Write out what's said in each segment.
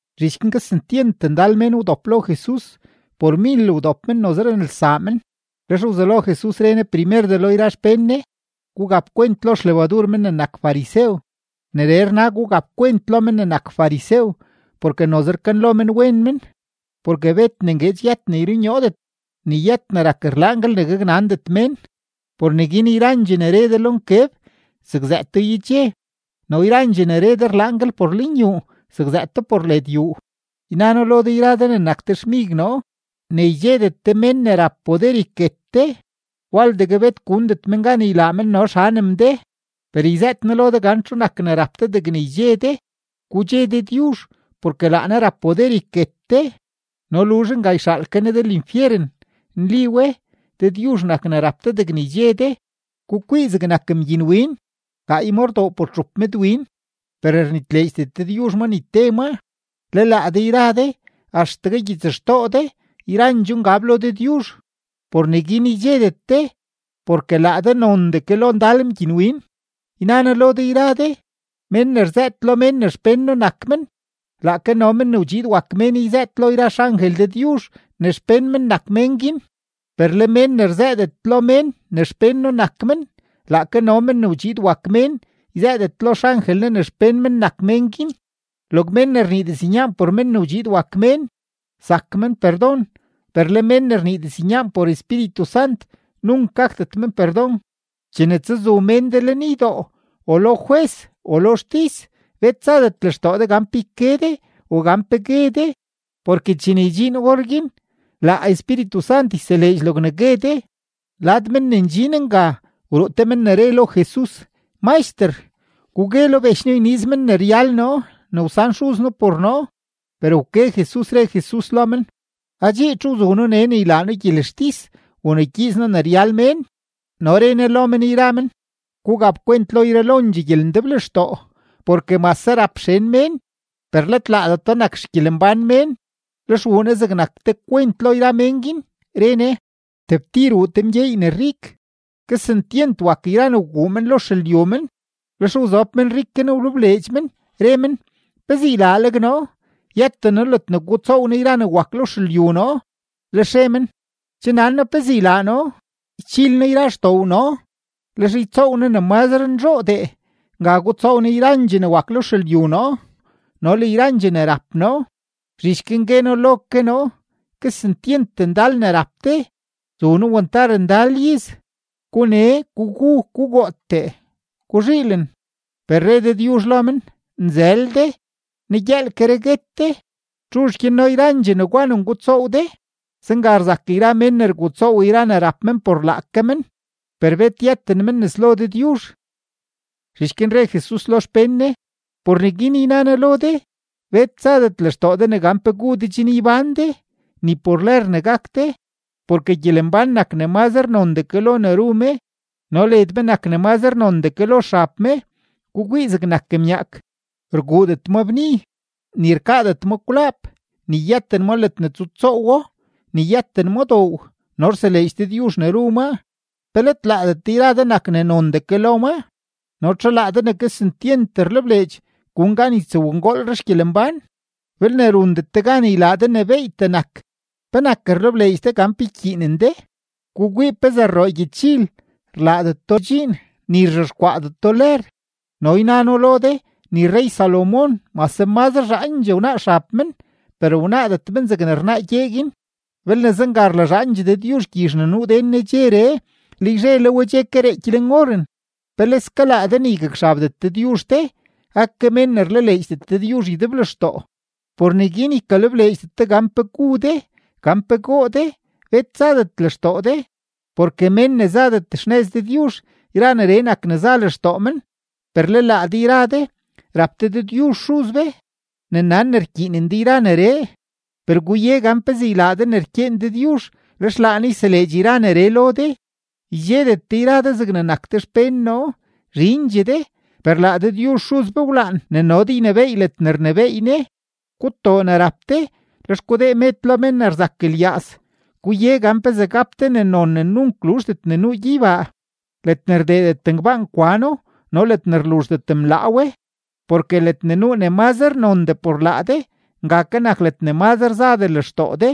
Zhich guin kesentyent ndal mén wdop lo Jesus, por mil wdop men, noze renelsaa men. Lex wzelo Jesus re Ne primerdee lo yra xpén Ne: ―Gugap kwent lo xlebadur men ne nak farisew. Neree rna gugap kwent lo men ne nak farisew porke noze rkanlo men wen men. Porke bet ne ngueedx yët ne yrunyoodet, ni yët ne rak rlaanguel ne gaknandet mén. Por neguin yrandxee ne re de lo nkeb, zakzëëto yedxe; no yrandxee ne re de rlaanguel por lenyuu, zakzëëto por led yuu. ’Yna noo lo de yra de ne nak de xmig noo, ne ydxedet de mén ne rap poder yket de, waldegue bet gundet men gan ylaa men no xanem de. Per yzëët noo lo de gan txu nak ne rap de degne ydxe de: gudxe Dëdyuzh porke laa Ne rap poder yket de, no luzh nga, yxaal ke Ne de linfyeren. Nli we, Dëdyuzh nak ne rap de degne ydxe de. ’Gukwii zegnak mgyinwin; gaay maa rdoo por txup medwin. Per rnitleedxdet Dëdyuzh ma ni te maa. Le laa de yra de, axtegue gyitsxtoo de yrandxoo ngab lo Dëdyuzh. Por neguin ydxedet de, porke laa de nondee ke lo ndal mgyinwin. ’Yna noo lo de yra de, mén ne rzëët lo mén ne xpén noo nak men, laake no Men ne wdxiid wak Mén yzëët lo yra xangel Dëdyuzh ne xpén men nak mén guin. Per le mén ne rzëëdet lo mén ne xpén noo nak men, laake no Men ne wdxiid wak Mén yzëëdet lo xangel Ne ne xpén men nak mén guin. ’Log mén ne rnii diznyaan por Men ne wdxiid wak Mén, zak men perdon; per le men ne rnii diznyaan por Espíritu Sant, nunk gakdet men perdon. ’Chene tsazu mén de lenydoo o lo jwes o lo xtis, bet tsadet lextoo de gan pe yke de o gan pe gue de, porke chene ydxiin orguin, laa Espíritu Sant yseleedx logne gue de. Lad mén ne ndxin nga, wruu te men ne re lo Jesus: ―Maxter, gugue lo bech noo yniiz men ne ryal noo ne wsan xuz noo por noo. Per wke Jesus, re Jesus lo men: ―Adxii, ¿txu wzu noo nee ne ylaa noo gyelextis u ne ygyiiz noo ne ryal mén? No re Ne lo men yra men: ―Gugap kwent lo yralondxee gyelendeblextoo, porke mase rap xen mén, per let laadeto nak xgyelembán mén. Lex wuu Ne zegnak te kwent lo yra mén guin, re Ne: ―Tebtir wuu te mgyeey ne rik; kesentyent wak yra ne wguu men lo xelyu men. Lex wzob menrik guin wlebleedx men, re men: “¿Pezee ylaaleg noo? Yëten noo ledne gutsoow noo yra ne wak lo xelyu noo.” Lex re men: “Che nan noo pezee ylaa noo; ychil noo yra xdoow noo, lex ytsoow noo ne mazre nzhoodee; nga gutsoow noo yrandxee ne wak lo xelyu noo no le yrandxee ne rap noo. Zhich guin gue noo lo ke noo: Kesentyent ndal ne rap de, zuno wantar ndal iz. Gune, gugu, gugootee, guzhiilen.” Per re Dëdyuzh lo men: “Nzël de, negyëëlkeree guet de. ¿Txuzh gyanno yrandxee negwa ne ngutsoow de?” Zenga rzak yra mén ne rgutsoow yra ne rap men por laake men, per bet yëten men nes lo Dëdyuzh. Zhich guin re Jesus lo xpén Ne: ―Por neguin yna noo lo de: Bet tsadet lextoo de ne gan pe gu de chen ybán de, ni por lër ne gak de. Porke gyelembán nak ne mazre nondee ke lo ne ru me no led me nak ne mazre nondee ke lo xab me. Gukwii zegnak myaak; rguudet ma bni, ni rkaadet ma kwlaap, ni yëten ma ledne tsutsoowo, ni yëten ma doow, no rseleedx Dëdyuzh ne ru maa. ¿Pe let laadet de yra de nak ne nondee ke lo maa? No ¿txu laa de ne kesentyent rlebleedx gun gan ytsowngoolre xgyelembán? Belne rundet de gan ylaa de ne beeytee nak, ¿penak rlebleedx de gan pe ykyiinen de? ’Gukwii pezee rroo gyechil; rlaadeto dxiin, ni rzhexkwaadeto lër, no yna noo lo de ni rrey-Salomón mase mazre zhaandxee wnaa xab men, per wnaadet men zegne rnaa gyee guin. Belne zenga rlazhaandxee Dëdyuzh gyizh ne nuu den nedxeree, le yzhe le we che ke reeky leen oren, ¡peleske laa de ne ygakxabdet Dëdyuzh de, ake mén ne rlaleedxdet Dëdyuzh ydeblextoo! Por neguin ykalebleedxdet de gan pe gu de, gan pe goo de; bet tsadet lextoo de. Porke mén ne zadet xnëz Dëdyuzh, yra neree nak ne za lextoo men; per le laa de yra de, rap de Dëdyuzh Xuz be ne nan ne rkyiinen de yra neree. Per guye gan pezee ylaa de ne rkyeen Dëdyuzh, lex laa Ne yseleedx yra neree lo de. ’Ydxedet de yra de zegne nak de xpén noo. Zhindxee de, per laa Dëdyuzh Xuz be wlaan ne no de ynebééy ledne rnebééy Ne. Gutoo ne rap de, lex gudee med lo mén ne rzak lyaaz; guye gan pezee gap de ne non ne nunk luzhdet ne nuu gyeybaa, ledne rdeedet ngbaan kwano no ledne rluzhdet mlaa we. Porke ledne nuu ne mazre nondee por laa de, nga ke nak ledne mazre zadee lextoo de.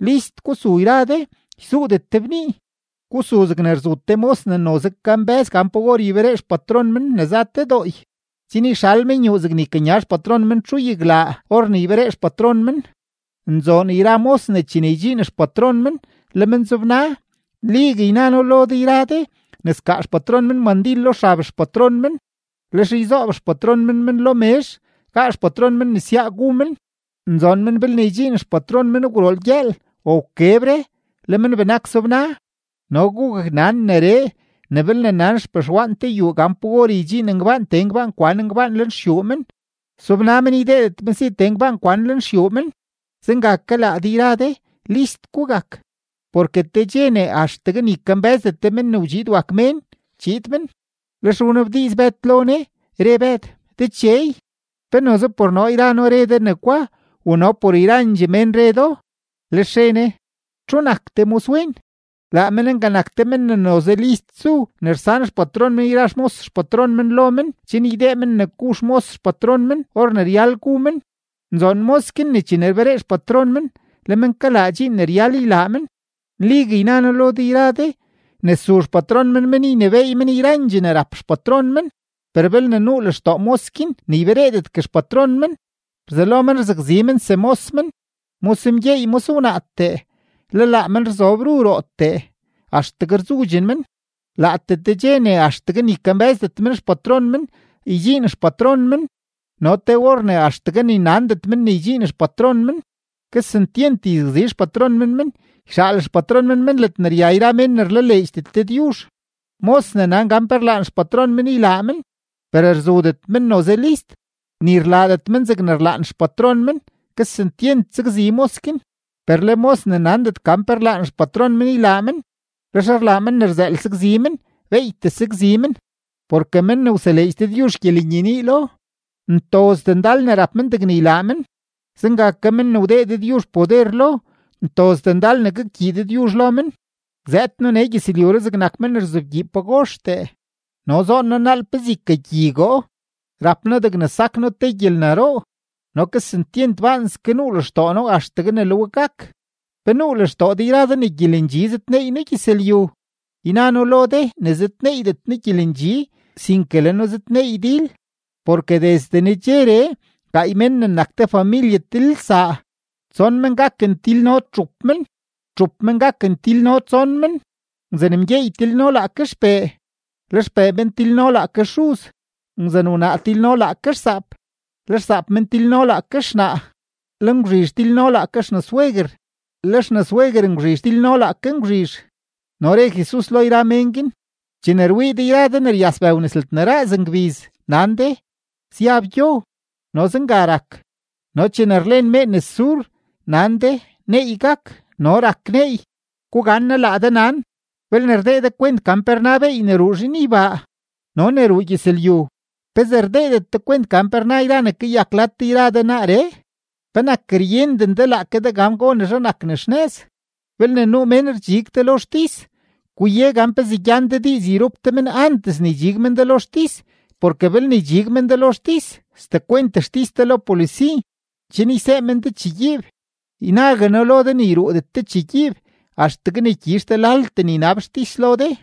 ’List gusu yra de; ysuudet de bnii. Gusu zegne rzu te mos ne noze kambë́z gan pa or yberee xpatron men ne za te dooy, chen yxal men yuu zegne ykanya xpatron men txuyaglaa or ne yberee xpatron men. Nzoon yra mos ne chene ydxiin xpatron men, le men zobna. Nligue yna noo lo de yra de ne skaa xpatron men mandil lo xab xpatron men, lex yzoob xpatron men men lo mezh, gaa xpatron men nesyaa gu men. Nzoon men belne ydxiin xpatron men gwrool gyëël o wkebre, le men benak zobna. No gugaknan neree, ne belne nan xpexwaan te yuu gan pa or ydxiin ngbaan tee ngbaan kwan ngbaan lenxyuu men, sobna men ydeedet men si tee ngbaan kwan lenxyuu men. Zenga ke laa de yra de, list gugak; porke te dxe ne axtegue ni kambë́zdet de Men ne wdxiid wak Mén, chiid men. Lex wnabdiiz Bëd lo Jesus, re Bëd: ―Dechey, ¿pe noze por noo yra noo re de negwa u no por yrandxee mén re do? Lex re Ne: ―¿Txu nak te moswen? Laa men nga nak te men ne noze list zu ne rsan xpatron men yra xmos xpatron men lo men chen ydee men ne gu xmos xpatron men or ne ryal gu men. Nzoon mos guin ne chene rberee xpatron men, le men kalaa dxiin ne ryal ylaa men. Nligue yna noo lo de yra de ne su xpatron men men ynebééy men yrandxee ne rap xpatron men. Per belne nuu lextoo mos guin ne ybereedetgue xpatron men, rzelo men rzakzi men semos men, mos mgyeey mos wnaatee, le laa men rzob ru rootee, axtegue rzudxen men. Laatee te dxe ne axtegue ni kambë́zdet men xpatron men, ydxiin xpatron men no te or ne axtegue ni nandet men ne ydxiin xpatron men. Kesentyent yzakzi xpatron men men, yxaal xpatron men men ledne rya yra mén ne rlaleedxdet Dëdyuzh. ’Mos ne nan gan pe rlaan xpatron men ylaa men, per rzudet men noze list, ni rlaadet men zegne rlaan xpatron men, kesentyent sakzi mos guin. Per le mos ne nandet gan pe rlaan xpatron men ylaa men, lex rlaa men ne rzëël sakzi men, beeytee sakzi men. Porke men ne wseleedx Dëdyuzh gyelenyenii lo, ntozdee ndal ne rap men degne ylaa men. Zenga ke men ne wdee Dëdyuzh poder lo, ntozdee ndal ne gakgyii Dëdyuzh lo men. ’Zëëd noo nee gyëzlyuree zegnak men ne rzobgyi pagoxtee; no ¡zoon noo naal pezee ykagyigoo! Rap noo degne sak noo te gyelnaroo, no ¡kesentyent baanske nuu lextoo noo axtegue ne le we gak! ¿Pe nuu lextoo de yra de ne gyelendxi zëdneey noo gyëzlyu? Yna noo lo de ne zëdneeydet noo gyelendxi, sinke le noo zëdneey dil. Porke desde nedxeree, gaay mén ne nak te familye tilelsaa, tson men gaken tilno txup men, txup men gaken tilno tson men. Ngwzan-mgyeey tilno laake xpee, le xpee men tilno laake xuz; ngwzan-wnaa tilno laake xsaap, le xsaap men tilno laake xnaa; le ngwzhizh tilno laake xnasweguer, le xnasweguer ngwzhizh tilno laake ngwzhizh. No re Jesus lo yra mén guin: ―Chene rwii de yra de ne ryas bëw nes ledne raaz ngbiz, nan de, syab gyo, no zenga rak. No chene rlen mee nes sur, nan de, neey gak, no rak neey. ¡Gugannaa laa de nan! Belne rdee de kwent gan pe rna beey ne ruu zhinybaa no ne ruu gyëzlyu, ¿pezee rdeedet de kwent gan pe rna yra ne kayak lad de yra de naaree? ’¿Penak ryenden de laake de gan gonezhe nak ne xnëz? Belne nuu mén rdxig de lo xtis, guye gan pezee gyan de diiz yrup de men antes ne ydxig men de lo xtis; porke belne ydxig men de lo xtis, sdekwent xtis de lo polisi, chen ysee men de chegyiib. Ynague noo lo de ne yruudet de chegyiib axtegue ne gyizh de laltee ne ynab xtis lo de.